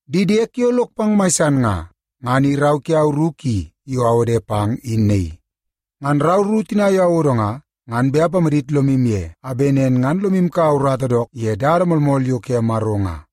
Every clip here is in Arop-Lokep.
Di diek yo lok pang mai san nga, ngan i rau kiau ru ki yo awode pang in naii. Ngan rau ru tina yo awodo nga, ngan bet apamadit lomu ye a bet nen ngan ole lomu kaua urata dook ye dada moolmool yo ke Maro nga.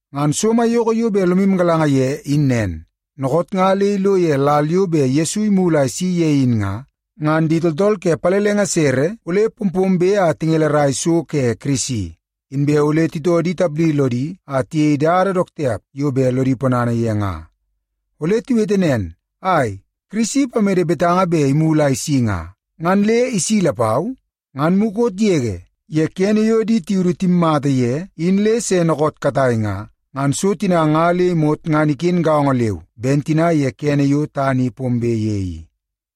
Ngan so maiyoko yo bet lomu galanga ye in nen: Dookoot nga le ilo ye lal yo bet Yesu imulu a isi ye in nga, ngan di tooltool ke pallenge sere ole pompombe a tingelerai so ke Kirisi. Inbe ole titoo di tapdi lodi a tiyei dada dook tiap yo bet lodi ponana ye nga. Ole tiwete nen, “Ai, Kirisi ipamede betanga bet imulu a isi nga, ngan le isi lapau? Ngan mukot yege ye kene yo di tiudu timmata ye in le se dookoot katai nga, ngan so tina nga le imot ngan iken gaongo leu ben tina ye kene yo tana i pombe ye i.”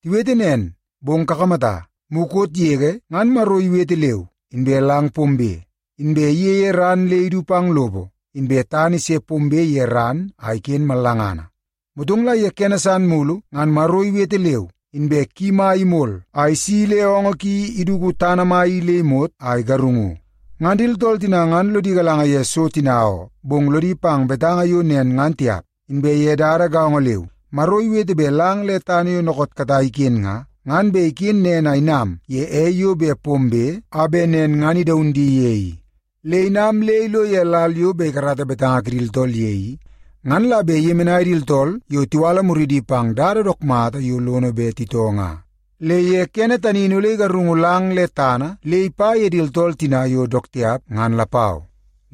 Tiwete nen, bong kakamata, mukot yege ngan Maro iwete leu, inbe lang pombe. Inbe iyeie ran le idu pang lopo, inbe tana ise pombe ye ran a iken mallangana. Motong la ye kene san mulu ngan Maro iwete leu, inbe ki mai imol a isi le oongoo ki iduku tana mai i le imot a igarungu. Ngan di tooltool tina ngan lodi galanga ye so tina oo, bong lodi pang betanga yo nen ngan tiap. Inbe ye dada gaongo leu, Maro iwete bet lang le tana yo dookoot katai iken nga, ngan bet iken nen a inam ye ei yo bet pombe a bet nen ngan idaun di ye i. Le inam le ilo ye lal yo bet ikarata betanga kidi tooltool ye i, ngan la bet iyemenai di tooltool yo tiwala muridi pang dada dook mata yo lono bet titoo nga. Le ye kene tani in ole igarung lang le tana le ipa ye di tooltool tina yo dook tiap ngan lapau.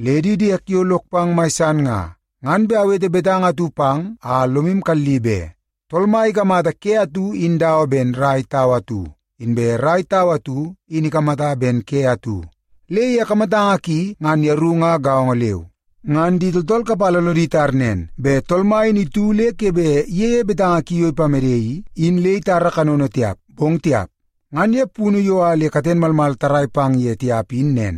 Le di diek yo lok pang mai san nga, ngan bet awete betanga atu pang a lomu kalli be. Tool Mai ikamata ke atu in dawa ben rai tau atu, inbe rai tau atu in ikamata ben ke atu. Le ye kamatanga ki ngan yeru nga gaongo leu. Ngan di tooltool kapala lodi tar nen bet Tool Mai in itu le ke bet iyeie betanga ki yo ipamede i, in le itara kanono tiap, bong tiap. Ngan ye punu yo a le katen malmal tarrai pang ye tiap in nen.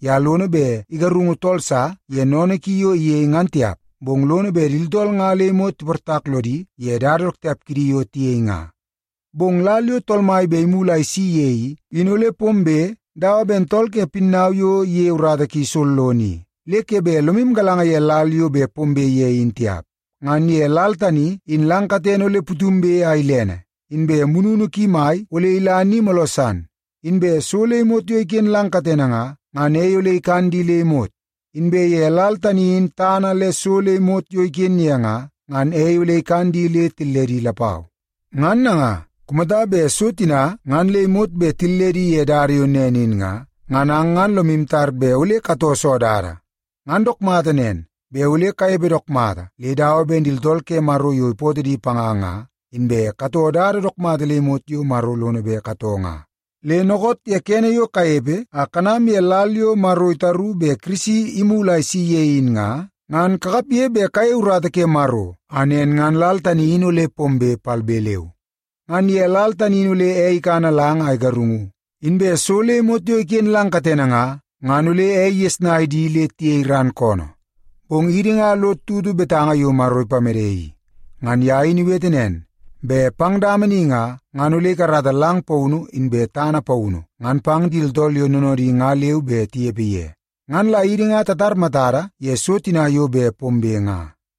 Ye lono bet igarungu tool sa ye sennene ki yo iyei ngan tiap, bong lono bet di tooltool nga le imot tiportak lodi ye dada dook tiap kidi yo tiyei nga. Bong lal yo Tool Mai bet imulu a isi ye i, in ole pombe dawa ben tool ke pinnau yo iyei urata ki sollono i, le ke bet lomu galanga ye lal yo bet pombe ye in tiap. Ngan ye lal tani in lang katene ole putumbe a ilene, inbe mununu ki mai ole ila ni mooloo san. Inbe so le imot yo iken lang katene nga, ngan ei ole ikan di le imot. Inbe ye lal tani in tana le so le imot yo iken ye nga, ngan ei ole ikan di le tilledi lapau. Ngan nanga, kumata bet so tina ngan le imot bet tilledi ye dada yo nen in nga, ngan ang ngan lomu tar bet ole katoo soo dada? Ngan dook mata nen, bet ole kanepe dook mata le dawa ben di tooltool ke Maro yo ipootoo di panga nga, inbe katoo dada dook mata le imot yo Maro lono bet katoo nga. Le dookoot ye kene yo kanepe a kanam ye lal yo Maro itaru bet Kirisi imulu a isi ye in nga, ngan kakapge bet kayei urata ke Maro a nen ngan lal tani in ole pombe palbe leu. Ngan ye lal tani in ole ei ikana lang a igarungu, inbe so le imot yo iken lang katene nga, ngan ole ei igesnai di le tiyei ran koonoo. Bong idi nga lod tutu betanga yo Maro ipamede i. Ngan ye in iwete nen, bet pang dama ni nga, ngan ole ikarata lang paunu inbe tana paunu ngan bet pang di tooltool yo noonoodi nga leu bet tinepe ye. Ngan la idi nga tatar matada ye so tina yo bet pombe nga.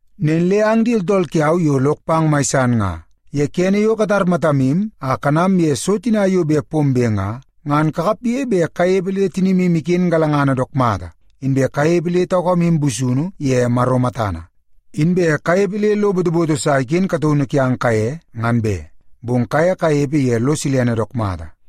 Nen le ang di tooltool kiau yo lok pang mai san nga, ye kene yo katar matamu a kanam ye so tina yo bet pombe nga, ngan kakapge bet kanepe le tinimu iken galangana dook mata, inbe kanepe le taukamu busunu ye Maro matana. Inbe kanepe le lo botoboto sa bet iken kataunu kiang kaye ngan be, bong kaye kanepe ye lo silene dook mata.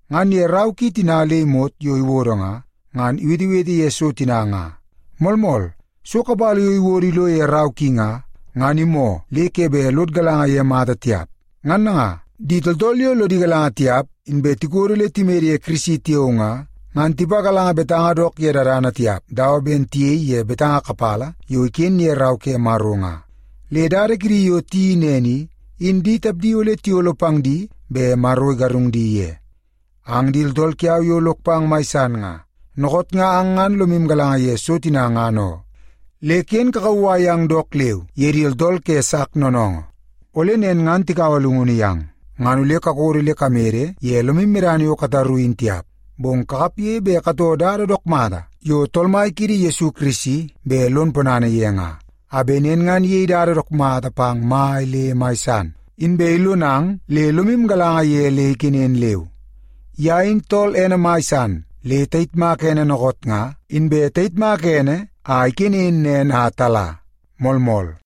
Ngan ye rau ki tina le imot yo iwodo nga, ngan iwetewete ye so tina nga. Moolmool, so kapala yo iwodo ilo ye rau ki nga, ngan imoo le ke bet lod galanga ye mata tiap. Ngan nanga, di tooltool yo lodi galanga tiap, inbe tikodo le timede ye Kirisi tiao nga, ngan tipagalanga betanga dook ye dadana tiap dawa ben tiyei ye betanga kapala yo iken ye Rau ke Maro nga. Le dada kidi yo tiyeii nen i, in di tapdi ole tiyolo pang di bet Maro igarung di ye. Ang di tooltool kiau yo lok pang mai san nga, dookoot nga ang ngan lomu galanga ye so tina ngan oo. Le ken kakauwai yang dook leu ye di tooltool ke sak noonoongoo. Ole nen ngan tikaua llungunu yang, ngan ole kakodo le kamede ye lomu medana yo kataru in tiap. Bong kakapge bet katoo dada dook mata yo Tool Mai kiidi Yesu Kirisi bet lon ponana ye nga, a bet nen ngan iyei dada dook mata pang mai le mai san, inbe ilonang le lomu galanga ye le ikenen leu. Ye in tool ene mai san le tayitmak ene dookoot nga, inbe tayitmaka ene a ikenen nen a tala. Moolmool.